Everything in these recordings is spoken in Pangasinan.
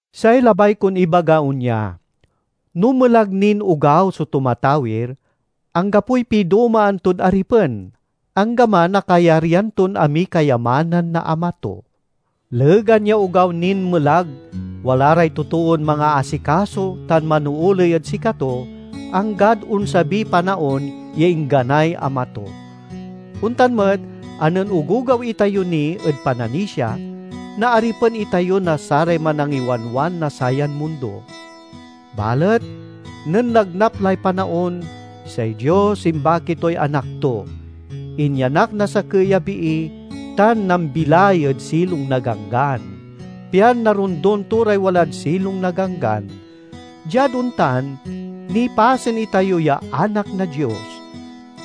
Say labay kon ibaga onya: no melag nin ogaw so tumatawir, anggapoy pidomaan tod aripen, anggaman a kayaryan ton amiy kayamanan na ama to. Legan ya ogaw nin melag wala ray totoon mangaasikaso tan manooley ed sikato, anggad onsabiy panaon ya ingganay ama to. Ontan met a nen ogogaw itayo ni ed pananisia, naaripen itayo na saray manangiwanwan na sayan mundo. Balet nen nagnap lay panaon, say Dios imbaki toy Anak to. Inyanak na sakey a bii, tan nambilay ed silong na Ganggan, pian narondon to ray walad silong na Ganggan. Diad ontan, nipasen itayo ya anak na Dios.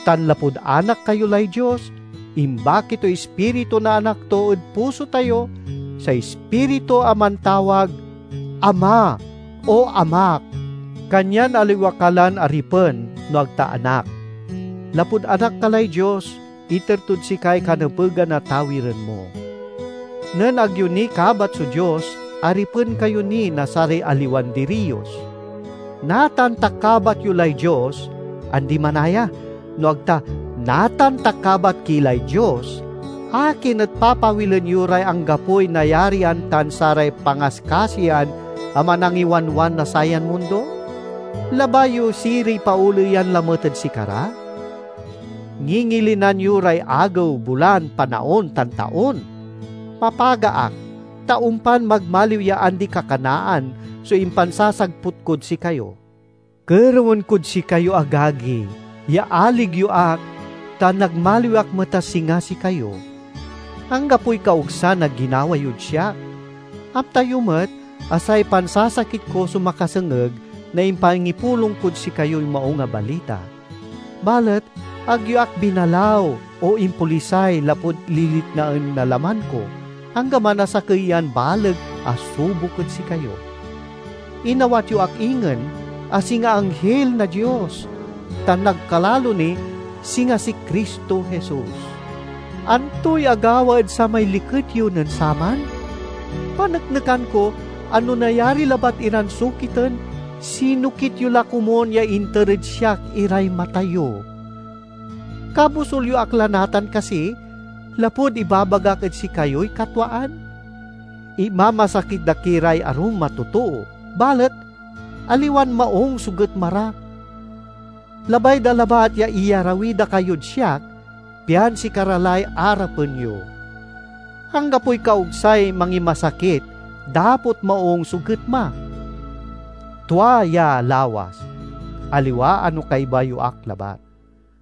Tan lapud anak kayo lay Dios, imbaki toy Ispiritu na Anak to ed puso tayo say Ispiritu a mantawag, "Ama, O Amak." Kanyan aliwa ka lan aripen, no ag ta anak. Lapud anak ka lay Dios, iter tod sikay kanepegan a tawiren mo. Nen ag yo ni kabat so Dios, aripen kayo ni na saray aliwan diriyos. Natan ta kabat yo lay Dios—andi manaya, no ag ta natan ta kabat ki lay Dios—akin et papawilen yo ray anggapoy nayarian tan saray pangaskasiyan a manangiwanwan na sayan mundo? Labay yo siriy paoleyan lamet ed sikara? Ngingilinan yo ray agew, bulan, panaon, tan taon! Mapaga ak, ta ompan magmaliw ya andi-kakanaan so impansasagput kod sikayo. Kerewen kod sikayo, agagi, ya alig yo ak ta nagmaliw ak met a singa sikayo. Anggapoy kaogsan a ginawa yod siak. Amta yo met a say pansasakit ko so makasengeg na impangipulong kod sikayoy Maung a Balita. Balet ag yo ak binalaw o impolisay lapud liliknaen na laman ko, anggaman a sakey yan baleg a subok ed sikayo. Inawat yo ak ingen a singa anghil na Dios, tan nagkalalo ni, singa si Cristo Jesus! Antoy agawa ed samay liket yo nen saman? Paneknekan ko a no nayari labat iran sokiten, sinokit yo la komun ya inter ed siak iray mata yo. Kabosul yo ak la natan kasi lapud ibabagak ed sikayoy katwaan? Imamasakit da ki ray arum a totoo, balet aliwan maung so getma ra. Labay da labat ya iyarawi da kayod siak pian sikara lay arapen yo. Anggapoy kaogsay mangimasakit, dapot maung so getma; tua ya lawas, aliwa a no kaiba yo ak labat!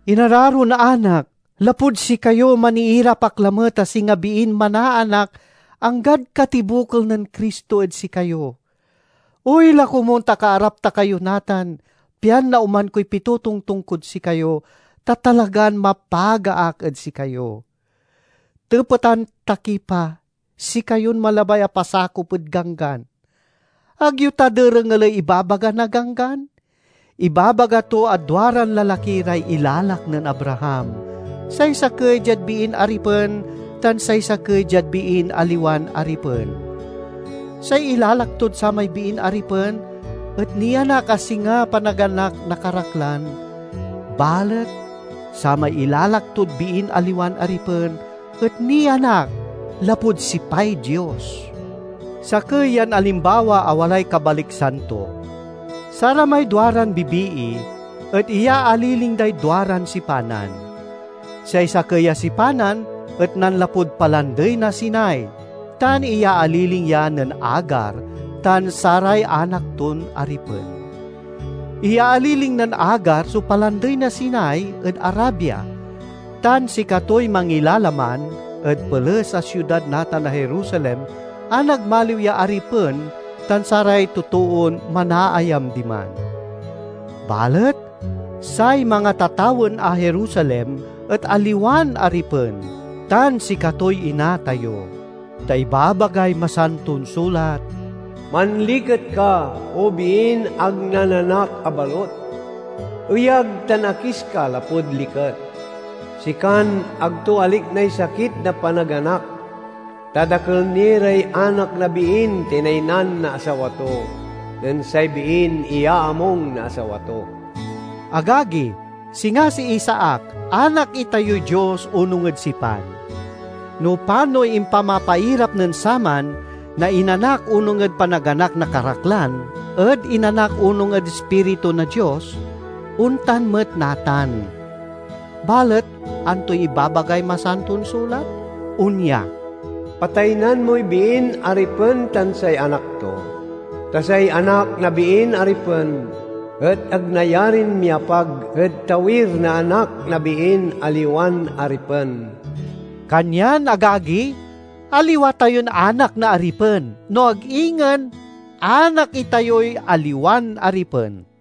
Inararon anak, lapud sikayo, maniirap ak lamet a singa biin manaanak, anggad katibokel nen Cristo ed sikayo. Oy la komun ta kaarap ta kayo natan pian naoman koy pitotongtong kod sikayo, ta talagan mapaga ak ed sikayo! Tepetan ta ki pa, sikayon malabay a pasakop ed Ganggan: ag yo ta derengeley ibabaga na Ganggan? Ibabaga to a duaran lalaki ray ilalak nen Abraham, say sakey diad biin aripen tan say sakey diad biin aliwan aripen. Say ilalak tod samay biin aripen et nianak a singa panaganak na karaklan, balet samay ilalak tod biin aliwan aripen et nianak lapud sipay Dios. Sakey yan alimbawa a walay kabaliksan to: saramay duaran bibii et iyaaliling day duaran sipanan. Say sakey a sipanan et nanlapud Palandey na Sinai tan iyaaliling ya nen Agar tan saray anak ton aripen. Iyaaliling nen Agar so Palandey na Sinai ed Arabia, tan sikatoy mangilalaman ed peles a siudad natan a Jerusalem a nagmaliw ya aripen tan saray totoon manaayam diman. Balet say mangatatawen na Jerusalem et aliwan aripen, tan sikatoy ina tayo. Ta ibabagay Masanton Sulat, "Manliket ka, O biin ag nananak a balut! Eyag tan akis ka lapud liket, sikan ag to aliknay sakit na panaganak! Ta dakel ni ray anak na biin tinaynan na asawa to, nen say biin iyaamung na asawa to." Agagi, singa si Isaac, anak itayoy Dios onung ed sipan. No panoy impamapairap nen saman na inanak onung ed panaganak na karaklan ed inanak onung ed Ispiritu na Dios, ontan met natan. Balet antoy ibabagay Masanton Sulat? Onya, "Pataynan moy biin aripen tan say anak to; ta say anak na biin aripen et ag nayarin miapag ed tawir na anak na biin aliwan aripen." Kanyan, agagi, aliwa tayon anak na aripen, no ag ingen anak itayoy aliwan aripen.